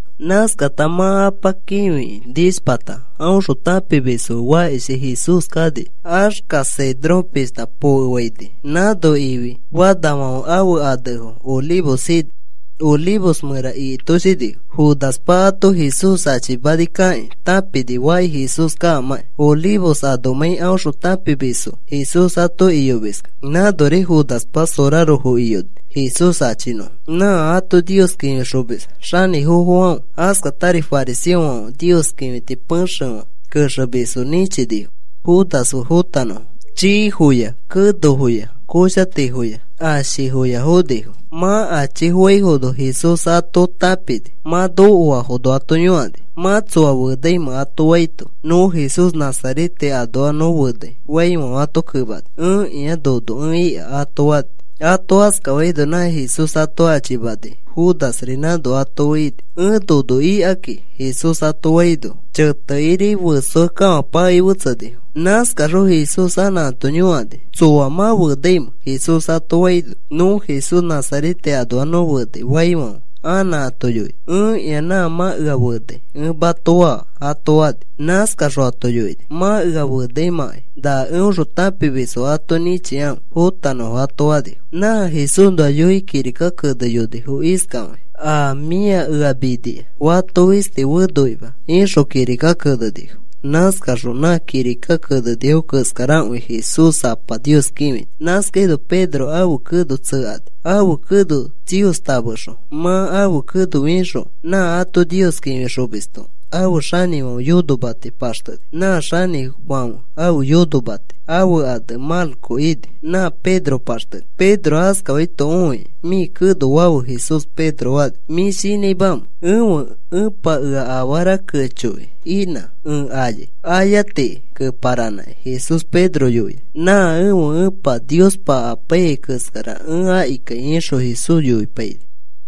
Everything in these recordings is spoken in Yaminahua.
Nãskata mã Apa kĩfikĩ nishpata aõxõ tãpimisfo fe fakishi Jesús kani, xexa Cedrón pishta pokefaini. Nãno ifi fanafãfe ãfe anefo olivos ini. Olivos mẽra ikitoshinifo. Judaspa ato Jesús achimani kakĩ tãpini faki Jesús kaamãki, Olivos anomãi aõxõ tãpimisfo Jesús ato iyomiskẽ. Nãnori Judaspa sorarofo iyoni Jesús achinõfo. Nã ato Nios kĩfixomis xanĩfofofãfe askatari fariseofãferi Nios kĩfiti pexefã kexemisfo nĩchinifo Judas fe fõtanõfo. Chiifoya kenofoya koshatifoya ashifoya fonifo. Mã achifofãifono Jesús ato tãpini. Mã nokoafono ato yõkani: “¿Mã tsoa fenaimẽ?” ato faito, “Nõ Jesús Nazarete anoa nõ fenai,” faifãfe, ato kemani: “Ẽkĩa, nono ẽ ika,” ato fani. Ato askafaino nã Jesús ato achimanai Judasri nãno ato fe ini. “Ẽ nono ikaki,” Jesús ato faino, chetekiri ifiakekafãpakei fetsenifo. Nãskaxõ Jesús anã ato yõkani: “¿Tsoa mã fenaimẽ?” Jesús ato faino, “Nõ Jesús Nazarete anoa nõ fenai,” faifãfe anã ato yoini: “Ẽkĩa nã mã ea fenai ẽ mato faa,” ato fani. Nãskaxõ ato yoini: “Mã ea fenamãkai na eõxõ tãpimisfo ato nĩchikãfe fotanõfo,” ato fani. Nã Jesúsnoa yoikĩ kirika keneyonifo iskafakĩ: “A mĩa ea minia fato fisti fenoima,” ixõ kirika kenenifo. Nãskaxõ nã kirika kenenifo keskarakõi Jesús Apa Nios kĩfini. Nãskaino Pedro ãfe keno tsekani, ãfe keno tsiostamexõ. Mã ãfe keno fixõ nã ato Nios kĩfixomisto ãfe xanĩfãfe yonomati paxteni. Nã xanĩfãfe ãfe yonomati ãfe ane Malco ini. Nã Pedro paxteni. Pedro askafaito õikĩ, “Mĩ keno fafe,” Jesús Pedro fani. “¿Mĩ shinãimamẽ? Ẽfe Epa ea afara kechoki inã ẽ ayai,” ayatiki keparanãkĩ Jesús Pedro yoini. “Nã ẽfe Epa Niospa apaiyai keskara ẽ akikai,” ixõ Jesús yoipaini.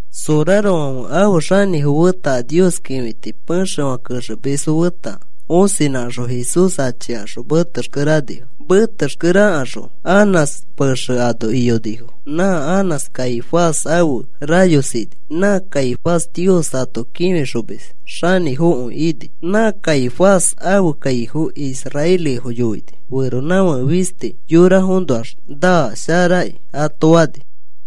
Sorarofãfe ãfe xanĩfo feta a Nios kĩfiti pexefã kexemisfo feta osinãkaxõ Jesús achikaxõ metexkere anifo. Metexkere akaxõ Anás pexe ano iyonifo. Nã Anás Caifás ãfe rayos ini. Nã Caifás Nios ato kĩfixomis xanĩfokõi ini. Nã Caifás ãfe kaifo israelifo yoini: “Feronãfake fisti yorafoõnoax naa, sharaki,” ato fani.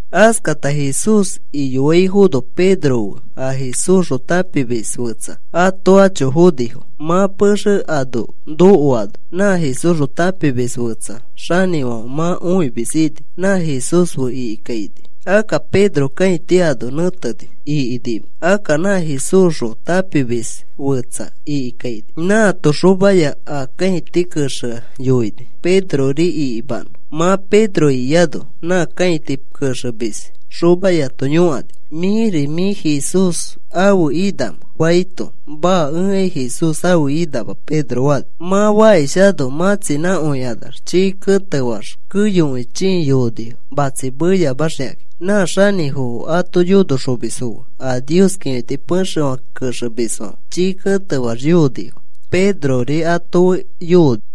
Askata Jesús iyoaifono Pedro fe a Jesúsxõ tãpimis fetsa ato acho fonifo. Mã pexe ano nokoano nã Jesúsxõ tãpimis fetsa xanĩfãfe mã õimis ini. Nã Jesús fe ikikaini. Akka Pedro kãiti ano nẽteni, ikinima. Akka nã Jesúsxõ tãpimis fetsa ikikaini. Nãato xomaya a kãiti kexea yoini Pedrori ikimanõ. Mã Pedro ikiano nã kãiti kexemis xomayato yõkani: “¿Mĩri mĩ Jesús ãfe inamẽ?” faito, “Maa, ẽkai Jesús ãfe inama,” Pedro fani. Mã fakishano matsinãkõikanax chii ketefaax keyokõi chii yoonifo matsi meyamaxikakĩ. Nã xanĩfofo ãto yonoxomisfo fe a Nios kĩfiti pexefã kexemisfãfe chii ketefaax yoonifo. Pedrori ato fe yooni.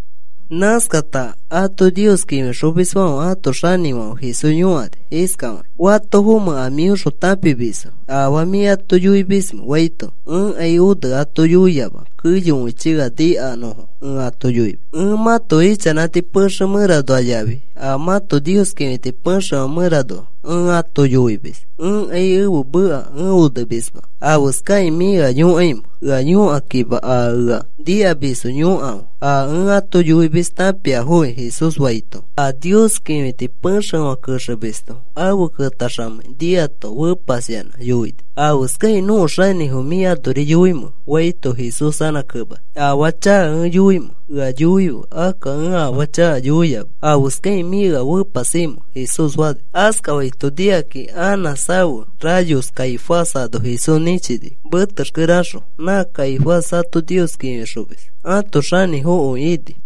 Nãskata ato Nios kĩfixomisfãfe ãto xanĩfãfe Jesús yõkani iskafakĩ: “¿Fatofomẽ a mĩõxõ tãpimisfo? ¿Afaa mĩ ato yoimismẽ?” faito, “Ẽkai one ato yoiama. Keyokõichi ea nikanõfo ẽ ato yoimis. Ẽ mãto ichanãti pexe mẽranoa yafi a mãto Nios kĩfiti pexefã mẽranoa ẽ ato yoimis. Ẽkai ẽfe meka ẽ onemisma. ¿Afeskakĩ mĩ ea yõkaimẽ? Ea yõkakima a ea nikamisfo yõkafe. A ẽ ato yoimis tãpiafoki,” Jesús faito, a Nios kĩfiti pexefã kexemisto afe ketaxamei niato fepasyanã yoini: “¿Afeskakĩ nõko xanĩfo mĩ anori yoimẽ?” faito, Jesús anã kemani: “Afaa chaka ẽ yoimẽ ea yoife. Akka ẽ afaa chaka yoiama ¿afeskakĩ mĩ ea fepasimẽ?” Jesús fani. Askafaito nikakĩ Anás ãfe rayos Caifás ano Jesús nĩchini metexkere axõ. Nã Caifás ato Nios kĩfixomis ãto xanĩfokõi ini.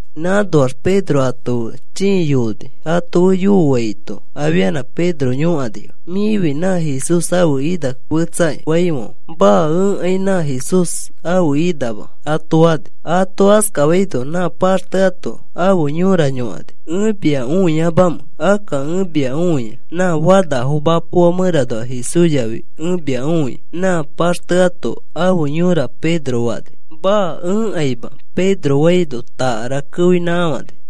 Nãnoax Pedro ato fe chĩi yooni. ato fe yooaito afianã Pedro yõkanifo: “Mĩfi nã Jesús ãfe ina fetsakĩ,” faifãfe, “Maa, ẽkai nã Jesús ãfe inama,” ato fani. Ato askafaino nã paxteato afe yõra yõkani: “¿Ẽ mia õiamamẽ? Akka ẽ mia õia. Nã fanafo mapoa mẽranoa Jesús yafi ẽ mia õia,” nã paxteato afe yõra Pedro fani. “Maa. Ẽkaima,” Pedro faino takara keoinãkafani.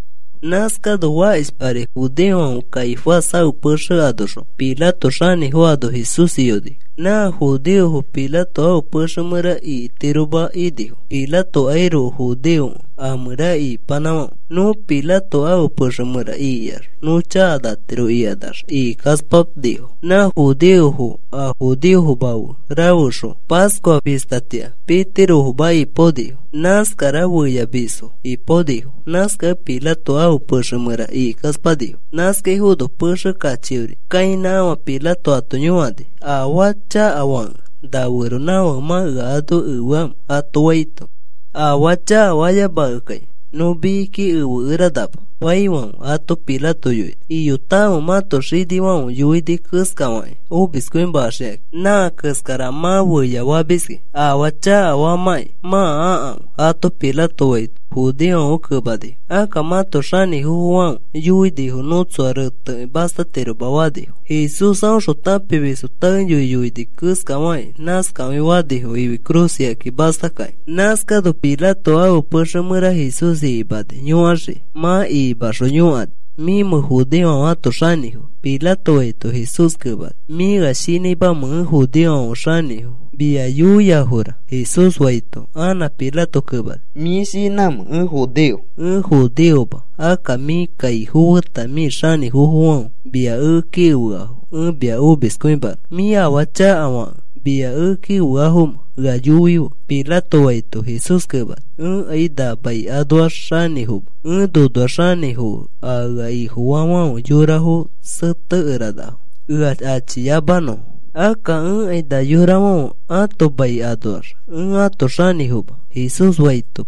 Nãskano fakishpari judeofãfe Caifás ãfe pexe anoxõ Pilato xanĩfo ano Jesús iyonifo. Nã judeofo Pilato ãfe pexe mẽra ikitiroma inifo. Pilatokairoko judeokẽ a mẽra ikipanãfãfe. “Nõ Pilato ãfe pexe mẽra ikiax nõ chakanatiro,” ikanax, ikikaspanifo. Nã judeofo a judeofoma fe rafexõ Pascua fistatĩa pitirofoma ipaonifo. Nãskara feyafamisfo ipaonifo. Nãskakẽ Pilato ãfe pexe mẽra ikikaspanifo. Nãskaifono pexe kachiori kãinãkafã Pilato ato yõkani: “¿Afaa chakafakẽ na feronãfake mã ea ano efeamẽ?” ato faito, “Afaa chakafayamakekai nõ mikiki efekeranama,” faifãfe, ato Pilato yoini: “Iyotakãfe. Mãto xinifãfe yoini keskafakĩ omiskõimaxikakĩ. Nã keskara mã feyafamiski. Afaa chakafamãki mã akãfe,” ato Pilato faito, judeofãfe kemanifo: “Akka mãto xanĩfofofãfe yoinifo nõ tsoa retekĩ mastatiroma,” fanifo. Jesús aõxõ tãpimisfo taeyoi yoini keskafakĩ nãskakõi fanifo ifi cruz ikaki mastakakĩ. Nãskano Pilato ãfe pexe mẽra Jesús ikimani yõkaxiki. Mã ikimaxõ yõkani: “¿Mĩmẽ judeofãfe ãto xanĩfo?” Pilato faito, Jesús kemani: “¿Mĩ ea shinãimẽ ẽ judeofãfe xanĩfo mia yoiaforaka?” Jesús faito, anã Pilato kemani: “¿Mĩ shinãmẽ ẽ judeo? Ẽ judeoma. Akka mĩ kaifo feta mĩ xanĩfofofãfe mia ekeki efeafo ẽ mia omiskõimanõ. ¿Mĩ afaa chakafakẽ mia ekeki efeafomẽ? Ea yoife,” Pilato faito, Jesús kemani: “Ẽkai na mai anoax xanĩfoma. Ẽ nonoax xanĩfokẽ a ea Ifofaafãfe yorafo setekeranafo ea achiyamanõfo. Akka ẽkai na yorafãfe ãto mai anoax ẽ ãto xanĩfoma,” Jesús faito,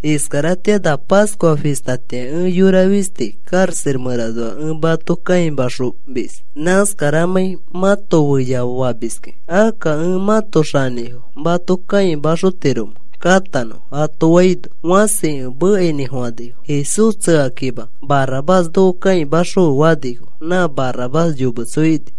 “Iskaratĩa na Pascua fistatĩa ẽ yora fisti karaxa mẽranoa ẽ mato kãimaxomis, nãskaramãi mãto feyafamiskẽ. ¿Akka ẽ mãto xanĩfo ẽ mato kãimaxotiromẽ katanõ?” ato faino, fãsikõi mekainĩfofãnifo: “¡Jesús tsekakima! ¡Barrabás noko kãimaxõfe!” fanifo. Nã Barrabás yometso ini.